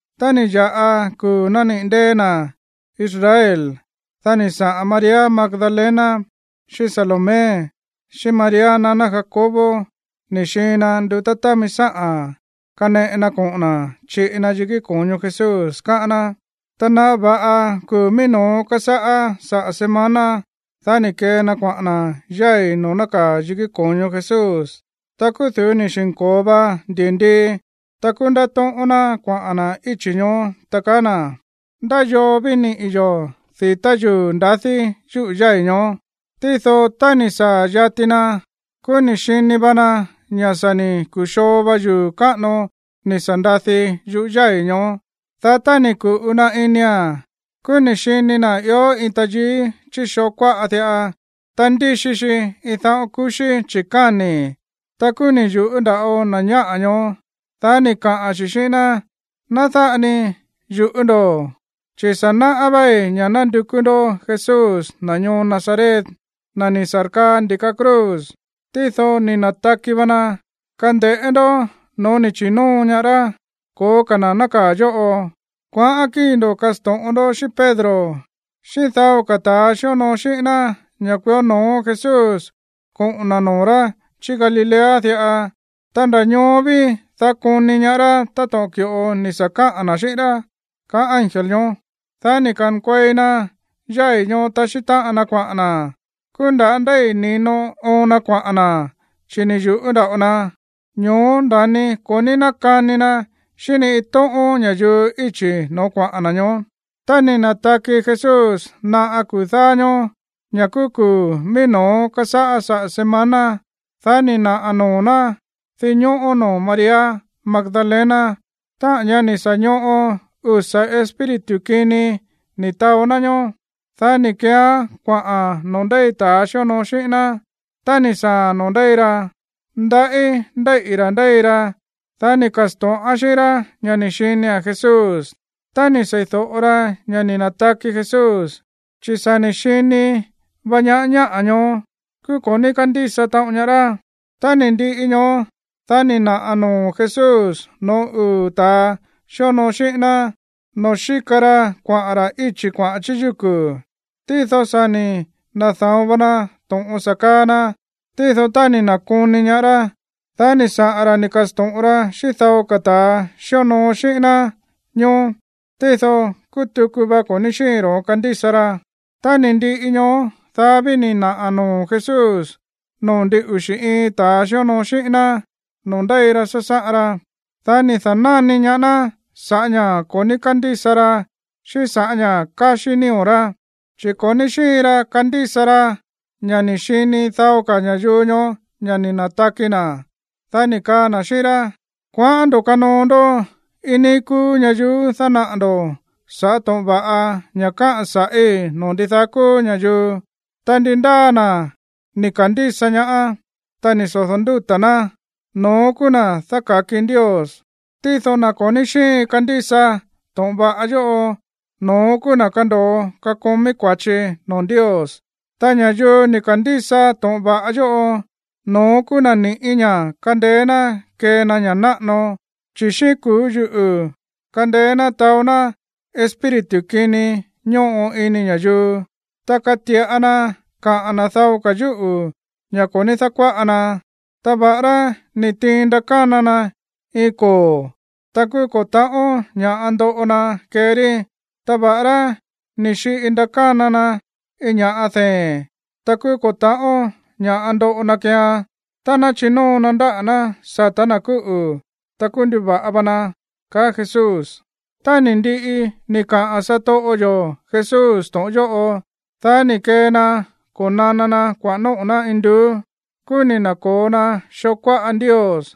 Tá ni̱ ya̱ꞌa kuu̱ nániꞌi̱ ndée̱ na̱ Israel, dá ni̱ saꞌa̱n María Magdalena, xíꞌín Salomé, xíꞌín María naná Jacobo ni̱ xiin na ndutá támi sáꞌa̱n kaneꞌe na koꞌo̱n na̱ chiꞌi na yikí ko̱ño Jesús, káꞌán ná. Ta naꞌa va̱ꞌa kuu̱ mií no̱ó kásáꞌá saꞌa̱ semana, dá ni̱ kee na kuaꞌa̱n na̱ yái̱ noo̱ nákaa̱ yikí ko̱ño Jesús. Ta kúú du̱ú ni̱ xi̱nko̱o va ndi̱ndii. Ta kúú ndátóꞌón ná kuaꞌa̱n na̱ íchi̱ ñoó, ta kaá na̱: ―¿Ndá yoo ví niꞌi̱ yo̱ di̱tá yuu̱ ndadí yúꞌu̱ yái̱ ñoó? Tído tá ni̱ saa̱ yati na, kúú ni̱ xini va na ña̱ sa̱ ni̱ ku̱xoo va yuu̱ káꞌano ni̱ sa̱ ndadi yúꞌu̱ yái̱ ñoó. Dá tá ni̱ ku̱ꞌu na inia̱n, kúú ni̱ xini na̱ ió iin tayií chí xoo kuáꞌa diꞌa. Ta ndíxi xi iin dáꞌo̱n kuxí chi̱káni̱. Ta kúú ni̱ yu̱ꞌú nda̱ꞌo na̱ ñáꞌa̱ ñoó. Dá ni̱ kaa xi̱ xíꞌín ná: ―Ná dáꞌa ni yu̱ꞌú ndo̱, chi̱ sa̱ náꞌá váí ña̱ nándukú ndó Jesús, na̱ ñoo Nazaret, na̱ ni̱ sa̱rkaa ndi̱ka cruz. Tído ni̱ na̱taki va na. Kande̱ꞌé ndó no̱ó ni̱ chi̱nóo ñaá rá. Ko̱ó ka̱ na̱ nákaa̱ yóꞌo. Kuaꞌán kíi̱ ndo̱ kasto̱ꞌon ndó xíꞌín Pedro, xíꞌín dao ka̱ ta̱a xíonoo xíꞌín ná ña̱ kuió no̱ó Jesús koꞌo̱n na̱ noo̱ rá chí Galilea diꞌa. Ta nda̱ ñoó ví, dá koni ñaá rá táto̱ꞌon ki̱ꞌo ni̱ sa̱ kaꞌa̱n na̱ xíꞌín rá ―kaá ángel ñoó. Dá ni̱ ka̱nkuei na yái̱ ñoó taxí táꞌan na kuaꞌa̱n na̱. Kúú nda̱á ndéi̱ ni̱no oon na kuaꞌa̱n na̱, chi̱ ni̱ yu̱ꞌú nda̱ꞌo na. Ño̱ó nda̱ni ko̱ ní nákani na xíꞌín ni iin tóꞌón ña̱yuu íchi̱ no̱ó kuaꞌa̱n na̱ ñoó. Tá ni̱ na̱taki Jesús naꞌa kuu̱ dáá ñóó, ña̱ kúú kuu̱ mií no̱ó kásáꞌá saꞌa̱ semana, dá ni̱ naꞌa̱ noo̱ ná dinñóꞌó noo̱ María Magdalena, táꞌa̱n ñá ni̱ sa̱ ñoꞌo usa̱ espíritu kini ni̱ taó ná ñoó. Dá ni̱ keeán kuaꞌa̱n noo̱ ndéi ta̱a xíonoo xíꞌín ná. Tá ni̱ saa̱a̱n noo̱ ndéi ra, ndaꞌí ndéíꞌi̱ rá ndéi ra. Dá ni̱ ka̱sto̱ꞌán xíꞌín rá ña̱ ni̱ xinia̱n Jesús. Tá ni̱ sei̱do̱ꞌo ra ña̱ ni̱ na̱taki Jesús, chi̱ sa̱ ni̱ xini va ñaá ñáꞌa̱ ñoó, kúú ko̱ ní kándísa taꞌon ñaá rá. Tá ni̱ ndiꞌi ñoó, dá ni̱ naꞌa̱ noo̱ Jesús no̱ó uu̱ ta̱a xíonoo xíꞌín ná noo̱ xíka ra kuaꞌa̱n ra̱ íchi̱ kuaꞌa̱n chí yúku̱. Tído sa̱ ni̱ na̱da̱on va na to̱ꞌon sa̱ kaa na. Tído tá ni̱ na̱koni ñaá rá, dá ni̱ saꞌa̱n ra̱ ni̱ ka̱sto̱ꞌon ra xíꞌín dao ka̱ ta̱a xíonoo xíꞌín ná ñoó. Tído kúú tuku va ko̱ ní xíin ro̱ón kandísa ra. Tá ni̱ ndiꞌi ñoó, dá ví ni̱ naꞌa̱ noo̱ Jesús noo̱ ndin uxi̱ iin ta̱ xíonoo xíꞌín ná noo̱ ndéi ra sásáꞌan ra. Dá ni̱ da̱náni ñaá ná sa̱ꞌá ña̱ ko̱ ní kándísa ra xíꞌín sa̱ꞌá ña̱ káxí nío̱ rá, chi̱ ko̱ ní xíin ra kandísa ra ña̱ ni̱ xini dao ka̱ ña̱yuu ñoó ña̱ ni̱ na̱taki na̱. Dá ni̱ kaa na̱ xíꞌín rá: ―Kuaꞌán ndo̱ kanoo ndó iin níí kúú ñayuú dánaꞌa̱ ndo̱ sa̱ꞌá to̱ꞌon va̱ꞌa ña̱ káꞌa̱n sa̱ꞌí noo̱ ndidaá kúú ña̱yuu. Ta ndi ndáa na̱ ni̱ ka̱ndísa ñaá, ta ni̱ sodo̱ ndúta̱ ná, no̱ón kúú na̱ dáka̱ki Ndios. Tído na̱ ko̱ ní xíin kandísa to̱ꞌon va̱ꞌa yóꞌo, no̱ón kúú na̱ kando̱o kakomí kua̱chi noo̱ Ndios. Ta ña̱yuu ni̱ ka̱ndísa to̱ꞌon va̱ꞌa yóꞌo, no̱ón kúú na̱ ni̱ꞌí ña̱ kandeé ná kee na ña̱ náꞌano. Chi̱ xíꞌín kuu̱ yuꞌu̱ kandeé ná taó ná espíritu kini ñóꞌo ini ña̱yuu. Ta kati̱ꞌa na kaꞌa̱n na̱ dao ka̱ yúꞌu̱, ña̱ ko̱ ní dákuáꞌa na. Ta va̱ꞌará ni̱ tiin ndakána na iin koo̱, ta kúú ko̱ ta̱ꞌón ña̱ꞌa ndoꞌo na kee rí. Ta va̱ꞌará ni̱ xiꞌi ndakána na iin ña̱ꞌa dee̱n, ta kúú ko̱ ta̱ꞌón ña̱ꞌa ndoꞌo na keean. Tá ná chinóo na ndáꞌa̱ ná sa̱tá na̱ kúꞌu̱, ta kúú nduva̱ꞌa va na ―kaá Jesús. Tá ni̱ ndiꞌi ni̱ kaꞌa̱n satoꞌo yo̱ Jesús to̱ꞌon yóꞌo, dá ni̱ kee na ko̱nana na kuaꞌa̱n nóꞌo̱ ná induú. Kúú ni̱ na̱ko̱o na xoo kuáꞌa Ndios.